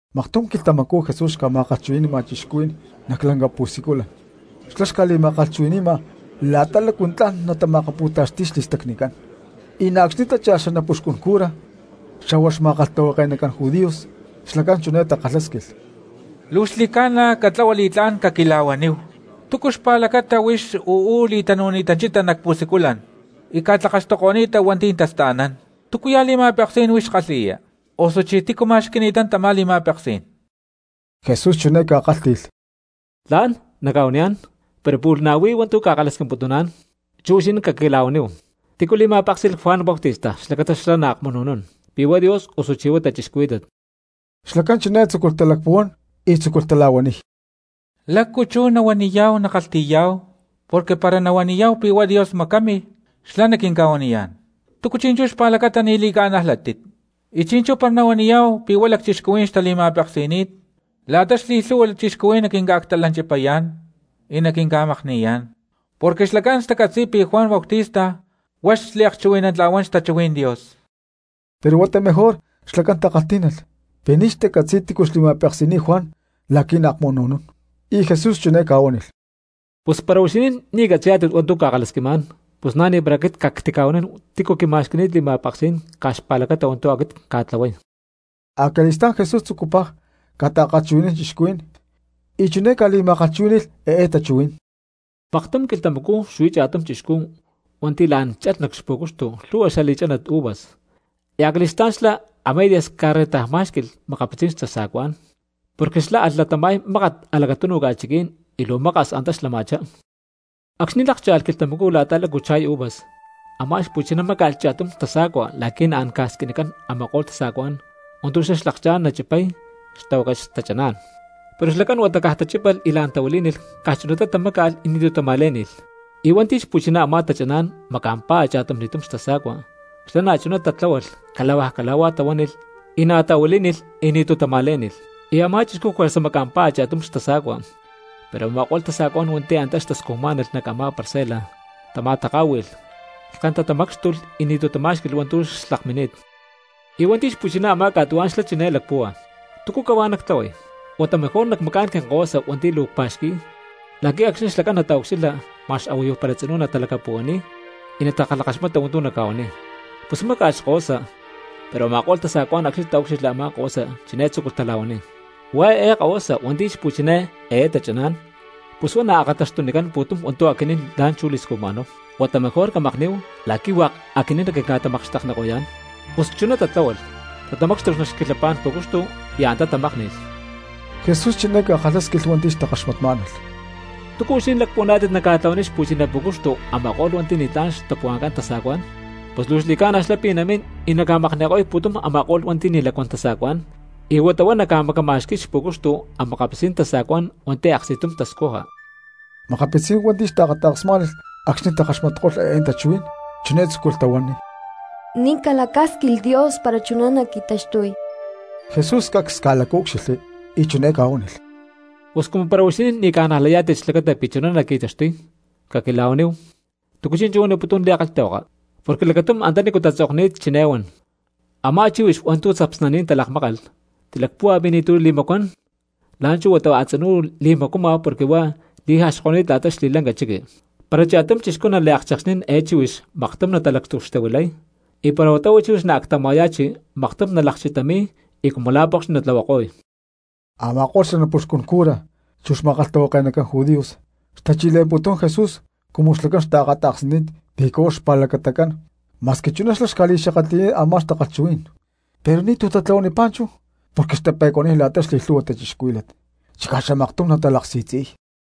Maktum quilhtamacú Jesús xca̠ma̠kalhchuhui̠ni̠ma cristianos nac lanca pu̠siculan, xlá xca̠li̠ma̠kalhchuhui̠ni̠ma la̠ta lácu tla̠n natama̠akapútaxti̠y xli̠stacnicán, y na̠ acxni̠ tachilh xanapuxcun cura xa̠hua xma̠kalhtahuake̠nacán judíos. Xlacán chiné takalhásquilh: —Luu xli̠ca̠na catlahua li̠tlá̠n caquila̠huaníhu túcu xpa̠lacata huix uú li̠tanu̠ni̠tanchita nac pu̠siculan y ca̠tlakaxtuko̠ni̠ta hua̠nti̠ tasta̠nán. ¿Túcuya̠ li̠ma̠peksí̠n huix kalhi̠ya? Osuchí ¿tícu ma̠xqui̠ni̠tán tamá li̠ma̠peksí̠n? Jesús chiné ca̠kálhti̠lh: —Tla̠n nacca̠huaniyá̠n, pero pu̠lh na̠ huí hua̠ntu̠ cca̠kalhasquimputuná̠n, chú huixinín caquila̠huaníhu. ¿Tícu li̠ma̠péksi̠lh Juan Bautista xlacata xlá naakmunu̠nún, pi̠ huá Dios, osuchí huá cristianos? Xlacán chiné tzúculh talacpuhuán y tzúculh tala̠huaniy: —¿Lácu chú nahuaniyá̠hu nakalhti̠yá̠hu? Porque para nahuaniyá̠hu pi̠ huá Dios macámilh xlá naquinca̠huaniyá̠n: “¿Túcu chi̠nchú xpa̠lacata ni̠ li̠ca̠najlátit?” Y chi̠nchú para nahuaniyá̠hu pi̠ huá lacchixcuhuí̠n xtali̠ma̠peksi̠ni̠t, la̠ta xli̠lhu̠hua cristianos naquinca̠actalanchipayá̠n y naquinca̠makni̠yá̠n. Porque xlacán tacatzi̠y pi̠ Juan Bautista huá xliakchuhui̠nantla̠huán xtachuhuí̠n Dios. Pero huata mejor xlacán takalhtí̠nalh pi̠ ni̠ xtacatzi̠y tícu xli̠ma̠peksi̠ni̠t Juan la̠qui̠ naakmunu̠nún. Y Jesús chiné ca̠huánilh: —Pus para huixinín ni̠ catzi̠yá̠tit hua̠ntu̠ cca̠kalhasquimá̠n, pus na̠ ni̠para aquit cactica̠huanín tícu quima̠xqui̠ni̠t li̠ma̠peksí̠n caj xpa̠lacata hua̠ntu̠ aquit cca̠tlahuay. Acali̠stá̠n Jesús tzucupaj ca̠ta̠kalhchuhui̠nán cristianos y chiné ca̠li̠ma̠kalhchuhuí̠ni̠lh eé tachuhuí̠n: —Maktum quilhtamacú xuí cha̠tum chixcú hua̠nti̠ la̠n chalh nac xpú̠cuxtu lhu̠hua xali̠chánat uvas, y acali̠stá̠n xlá a medias ca̠rrentajmá̠xqui̠lh makapitzí̠n tasa̠cuá̠n, porque xlá alh latama̠y mákat nac a̠lacatúnuj ca̠chiquí̠n y luu maka̠s antá xlama̠chá. Acxni̠ lákcha̠lh quilhtamacú la̠ta lácu cha̠y uvas, a̠má xpu̠chiná máca̠lh cha̠tum tasa̠cua la̠qui̠ naancán ca̠squinicán a̠ma̠ko̠lh tasa̠cuá̠n hua̠ntu̠ xlá xlakchá̠n nachipay xatahuácat xtachaná̠n. Pero xlacán huata caj tachípalh y la̠n tahuilí̠nilh, caj chunatá tamáca̠lh y ni̠tu̠ tama̠lé̠ni̠lh. Y hua̠nti̠ xpu̠chiná a̠má tachaná̠n maca̠mpá a̠cha̠tumli̠tum xtasa̠cua, xlá na̠chuná tatláhualh cala̠huaj cala̠huá tahuánilh y na̠ tahuilí̠nilh y ni̠tu̠ tama̠lé̠ni̠lh. Y a̠má chixcú juerza maca̠mpá a̠cha̠tum xtasa̠cua, pero a̠ma̠ko̠lh tasa̠cuá̠n hua̠nti̠ antá xtascujmá̠nalh nac a̠má parcela tama̠taká̠hui̠lh lhken tatamácxtulh y ni̠tu̠ tamá̠xqui̠lh hua̠ntu̠ xlakmini̠t. ’Y hua̠nti̠ xpu̠chiná a̠má ca̠tuhuá̠n xlá chiné lacpúhua: “¿Túcu cahuá nactlahuay? Huata mejor nacmacá̠n quinkahuasa hua̠nti̠ luu cpa̠xqui̠y la̠qui̠ acxni̠ xlacán nataucxilha ma̠x a̠huayu para tzinú natalacapuhuaniy y natakalhakaxmata hua̠ntu̠ naca̠huaniy.” Pus máca̠lh xkahuasa, pero a̠ma̠ko̠lh tasa̠cuá̠n acxni̠ taúcxilhli a̠má kahuasa chiné tzúculh tala̠huaniy: “Huá eé xkahuasa hua̠nti̠ xpu̠chiná eé tachaná̠n, pus huá naakata̠xtunicán pu̠tum hua̠ntu̠ aquinín la̠nchú li̠scujma̠náhu; huata mejor camakní̠hu la̠qui̠ hua̠k aquinín naquinca̠tamakxtekniko̠yá̠n.” Pus chuná tatláhualh, tatamácxtulh nac xquilhapá̠n pu̠cuxcu y antá tamákni̠lh. Jesús chiné ca̠kalhásquilh hua̠nti̠ xtakaxmatmá̠nalh: —¿Túcu huixinín lacpuhuaná̠tit naca̠tlahuaniy xpu̠chiná pú̠cuxtu a̠ma̠ko̠lh hua̠nti̠ ni̠tlá̠n xtapuhua̠ncán tasa̠cuá̠n? Pus luu xli̠ca̠na xlá pi̠ namín y naca̠makni̠ko̠y pu̠tum a̠ma̠ko̠lh hua̠nti̠ ni̠ lacuán tasa̠cuá̠n, y huata huá naca̠macama̠xqui̠y xpu̠cuxtu a̠makapitzí̠n tasa̠cuá̠n hua̠nti̠ aksti̠tum tascuja. Makapitzí̠n hua̠nti̠ xtaakata̠ksmá̠nalh acxni̠ takaxmatko̠lh eé tachuhuí̠n chiné tzúculh tahuaniy: —¡Ni̠ calacásquilh Dios para chuná naqui̠taxtuy! Jesús cacs ca̠lacaúcxilhli y chiné ca̠huánilh: —Pus cumu para huixinín ni̠ ca̠najlayá̠tit xlacata pi̠ chuná naqui̠taxtuy, caquila̠huaníhu, ¿túcu chinchú huaniputún nac li̠kalhtahuaka? Porque lacatum antanícu tatzokni̠t chiné huan: Amá chíhuix hua̠ntu̠ tzapsnaní̠n talakmákalh, tilacpúhua pi̠ ni̠tu̠ li̠macuán, la̠nchú huata huá a̠tzinú luu li̠macuama porque huá li̠jaxko̠ni̠t la̠ta xli̠lanca chiqui. Para cha̠tum chixcú naliakchekxnín eé chíhuix maktum natalactucxtahuilay; y para huata huá chíhuix naactama̠ya̠chi maktum nalakchitami̠y y cumu la̠ pokxni natlahuako̠y. Ama̠ko̠lh xanapuxcun cura chu xma̠kalhtahuake̠nacán judíos xtachi̠le̠mputún Jesús cumu xlacán xtaakata̠ksni̠t pi̠ caj huá xpa̠lacatacán ma̠squi chuná xlá xca̠li̠xakatli̠ni̠t a̠má takalhchuhuí̠n. Pero ni̠tu̠ tatlahuanipá chú porque xtape̠cuaniy la̠ta xli̠lhu̠hua cristianos, chicá xamaktum natalaksi̠tzi̠y.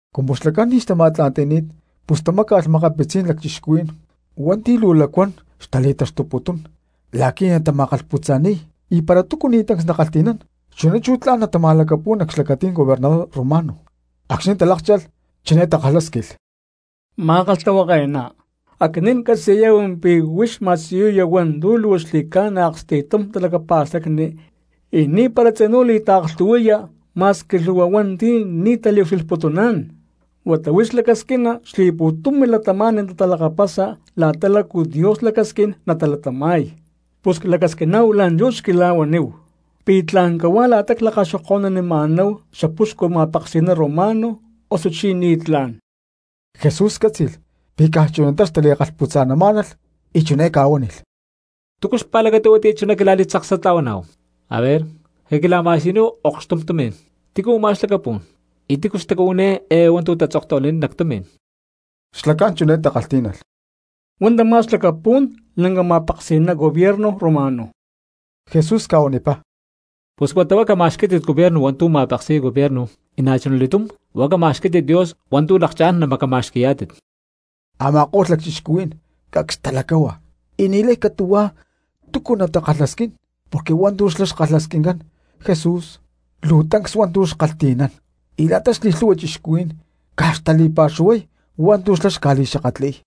Cumu xlacán ni̠ xtama̠tla̠nti̠ni̠t pus tamáca̠lh makapitzí̠n lacchixcuhuí̠n hua̠nti̠ luu lacuán cristianos xtali̠taxtuputún la̠qui̠ natama̠kalhputza̠ni̠y y para túcu ni̠ tancs nakalhti̠nán chuná chú natama̠lacapu̠y nac xlacatí̠n gobernador romano. Acxni̠ talákcha̠lh chiné takalhásquilh: —Ma̠kalhtahuake̠ná, aquinín ccatzi̠yá̠hu pi̠ huix ma̠siyuya hua̠ntu̠ luu xli̠ca̠na aksti̠tum talacapa̠stacni, y ni̠para tzinú li̠taaklhu̠hui̠ya ma̠squi lhu̠hua hua̠nti̠ ni̠ taliucxilhputuná̠n, huata huix lacasquina xli̠pu̠tum cristianos natalakapasa la̠ta lácu Dios lacasquín natalatama̠y. Pus clacasquiná̠hu la̠nchú xquila̠huaníhu, ¿pi̠ tla̠n cahuá la̠ta la̠ clakaxoko̠nunima̠náhu xapuxcu ma̠peksi̠ná romano, osuchí ni̠tlá̠n? Jesús cátzi̠lh pi̠ caj chunatá xtali̠kalhputzamá̠nalh y chiné ca̠huánilh: —¿Túcu xpa̠lacata huatiyá chuná quila̠li̠tzaksatla̠huaná̠hu? Aver, caquila̠ma̠siyuníhu okxtum tumi̠n. ¿Tícu u̠má xlacapú̠n, y tícu xtacuhuiní eé hua̠ntu̠ tatzoktahuilani̠t nac tumi̠n? Xlacán chiné takalhtí̠nalh —Huá tamá xlacapú̠n lanca ma̠peksi̠ná gobierno romano. Jesús ca̠huanipá: —Pus huata huá camacama̠xquí̠tit gobierno hua̠ntu̠ ma̠peksi̠y gobierno; y na̠chuna li̠túm huá camacama̠xquí̠tit Dios hua̠ntu̠ lakchá̠n namacama̠xqui̠yá̠tit. Ama̠ko̠lh lacchixcuhuí̠n cacs talacáhua y ni̠lay catu̠huá túcu natali̠kalhasquín porque hua̠ntu̠ xlá xkalhasquincán Jesús luu tancs hua̠ntu̠ xkalhti̠nán. Y la̠ta xli̠lhu̠hua cristianos caj xtali̠pa̠xuhuay hua̠ntu̠ xlá xca̠li̠xakatli̠y.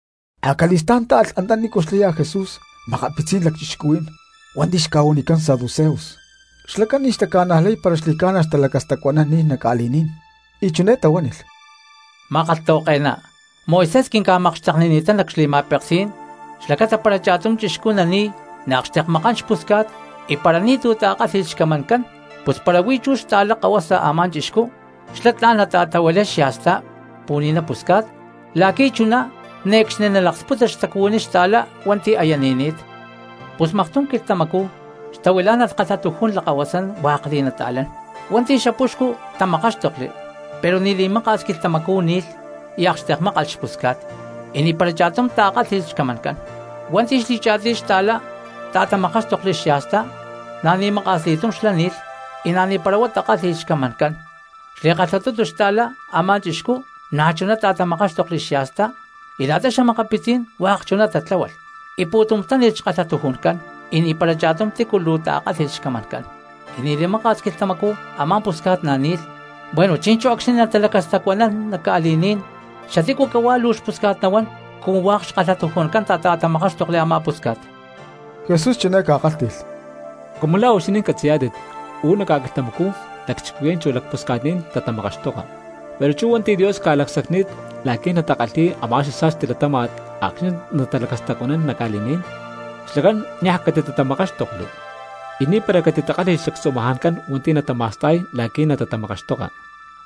Acali̠stá̠n táalh antanícu xlaya Jesús makapitzí̠n lacchixcuhuí̠n hua̠nti̠ xca̠huanicán saduceos, xlacán ni̠ xtaca̠najlay para xli̠ca̠na talacastacuanán ni̠n nac ca̠li̠ní̠n; y chiné tahuánilh: —Ma̠kalhtahuake̠ná, Moisés quinca̠makxteknini̠tán nac xli̠ma̠peksí̠n xlacata para cha̠tum chixcú nani̠y naakxtekmakán xpusca̠t y para ni̠tu̠ ta̠kálhi̠lh xcamancán pus para huí chú xta̠lá kahuasa a̠má chixcú, xlá tla̠n nata̠tahuilay xya̠stá pu̠ni̠na̠ pusca̠t la̠qui̠ chuná ne̠cxni nalaksputa xtacuhuiní xta̠lá hua̠nti̠ aya ni̠ni̠t. Pus maktum quilhtamacú xtahuilá̠nalh kalhatujún lakahuasán hua̠k li̠nata̠lán. Hua̠nti̠ xapuxcu tamakáxtokli, pero ni̠ li̠maka̠s quilhtamacú ni̠lh y akxtekmákalh xpusca̠t, y ni̠para cha̠tum ta̠kálhi̠lh xcamancán. Hua̠nti̠ xli̠cha̠tiy xta̠lá ta̠tamakáxtokli xya̠stá, na̠ ni̠ maka̠s li̠tum xlá na̠ ni̠pá y na̠ ni̠para huá ta̠kálhi̠lh xcamancán. Xli̠kalhatutu xtalá a̠má chixcú na̠chuná ta̠tamakáxtokli xya̠stá y la̠ta xa̠makapitzí̠n hua̠k chuná tatláhualh, y pu̠tum táni̠lh xkalhatujuncán y ni̠para cha̠tum tícu luu ta̠kálhi̠lh xcamancán. Y ni̠ li̠maka̠s quilhtamacú a̠má pusca̠t na̠ ni̠lh. Bueno, chi̠nchú acxni̠ natalacastacuanán nac ca̠li̠ní̠n, ¿xatícu cahuá luu xpusca̠t nahuán cumu hua̠k xkalhatujuncán tata̠tamakáxtokli a̠má pusca̠t? Jesús chiné ca̠kálhti̠lh: —Cumu la̠ huixinín catzi̠yá̠tit, uú nac ca̠quilhtamacú lacchixcuhuí̠n chu lacpusca̠tní̠n tatamakaxtoka. Pero chú hua̠nti̠ Dios ca̠lacsacni̠t la̠qui̠ natakalhi̠y a̠má xasa̠sti latáma̠t acxni̠ natalacastacuanán nac ca̠li̠ní̠n, xlacán niaj catitatamakáxtokli, y ni̠para catitakálhi̠lh xlactzumajancán hua̠nti̠ natama̠sta̠y la̠qui̠ natatamakaxtoka.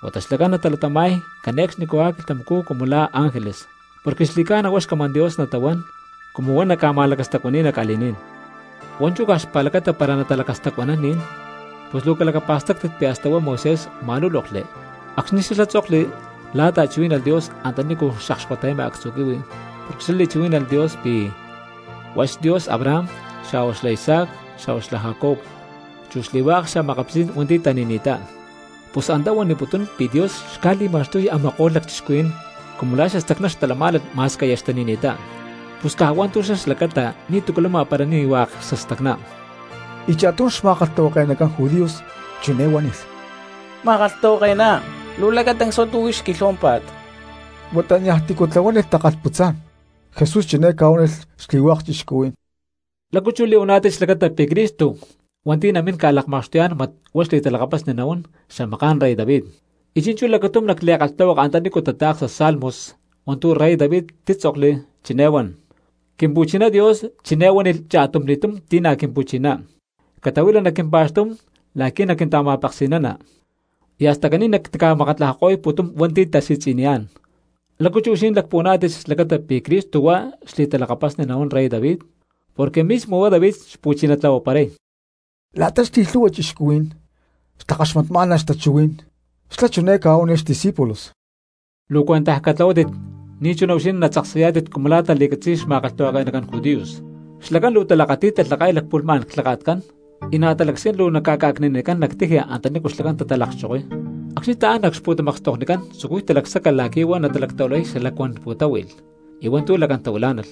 Huata xlacán natalatama̠y cane̠cxnicahuá quilhtamacú cumu la̠ ángeles, porque xli̠ca̠na huá xcamán Dios natahuán cumu huá naca̠ma̠lacastacuani̠y nac ca̠li̠ní̠n. Hua̠nchú caj xpa̠lacata para natalacastacuanán ni̠n, pus luu calacapa̠stáctit pi̠ hasta huá Moisés ma̠lúlokli acxni̠ xlá tzokli la̠ ta̠chuhuí̠nalh Dios antanícu xakxkota̠yama actzu̠ quihui porque xlá li̠chuhuí̠nalh Dios pi̠ huá xDios Abraham, xa̠huá xla Isaac, chu xla Jacob, chu xli̠hua̠k xa̠makapitzí̠n hua̠nti̠ tani̠ni̠ttá. Pus antá huaniputún pi̠ Dios xca̠li̠ma̠xtuy a̠ma̠ko̠lh lacchixcuhuí̠n cumu la̠ xastacná xtalamá̠nalh ma̠squi aya xtani̠ni̠ttá; pus caj hua̠ntu̠ xlá xlacata ni̠tu̠cu lama para ni̠ hua̠k xastacná. Y cha̠tum xma̠kalhtahuake̠nacán judíos chiné huánilh: —Ma̠kalhtahuake̠ná, luu lacatancs hua̠ntu̠ huix quilhuámpa̠t. Huata niaj tícu tlahuánilh takalhputzá̠n. Jesús chiné ca̠huánilh xli̠hua̠k cristianos: —¿Lácu chú li̠huaná̠tit xlacata pi̠ Cristo hua̠nti̠ naminá̠n ca̠lakma̠xtuyá̠n mat huá xli̠talakapasni nahuán xamaká̠n rey David? Y chi̠nchú lacatum nac li̠kalhtahuaka antanícu tata̠ksa Salmos hua̠ntu̠ rey David títzokli chiné huan: Quimpu̠chiná Dios chiné huánilh cha̠tumli̠túm ti̠ na̠ Quimpu̠chiná: “Catahuila nac quimpa̠xtú̠n la̠qui̠ naquinta̠ma̠peksi̠nana, y hasta caní nactica̠makatlajako̠y pu̠tum hua̠nti̠ tasi̠tzi̠niyá̠n.” ¿Lácu chú huixinín lacpuhuaná̠tit xlacata pi̠ Cristo huá xli̠talakapasni nahuán rey David, porque mismo huá David xpu̠chiná tlahuaparay? La̠ta xli̠lhu̠hua cristianos xtakaxmatmá̠nalh xtachuhuí̠n, xlá chiné ca̠huánilh xdiscípulos: —Luu cuentaj catlahuátit ni̠chuná huixinín natzaksayá̠tit cumu la̠ tali̠catzi̠y xma̠kalhtahuake̠nacán judíos, xlacán luu talakati̠y talhaka̠y lacpu̠lhmá̠n clhaka̠tcán, y na̠ talacasquín luu naca̠ca̠cni̠nanicán nac tiji antanícu xlacán talata̠kchokoy. Acxni̠ taán nac xpu̠tamakstoknicán tzucuy talacsaca la̠qui̠ huá natalactahuilay xalacuán pu̠táhui̠lh, y hua̠ntu̠ lacán tahuilá̠nalh;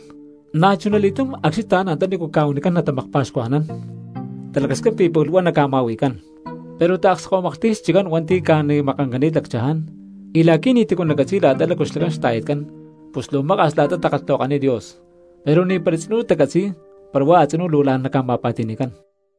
na̠chuna li̠túm acxni̠ taán antanícu ca̠huanicani̠t natamakpa̠xcuajnán, talacasquín pi̠ pu̠lh huá naca̠ma̠hui̠cán. Pero taakskahuimaklhti̠y xchiccán hua̠nti̠ ca̠ni̠makancani̠t lacchaján, y la̠qui̠ ni̠ti̠cu natacatzi̠y la̠ta lácu xlacán xta̠yatcán pus luu maka̠s la̠ta takalhtahuakaniy Dios. Pero ni̠para tzinú tacatzi̠y para huá a̠tzinú luu la̠n naca̠ma̠pa̠ti̠ni̠cán.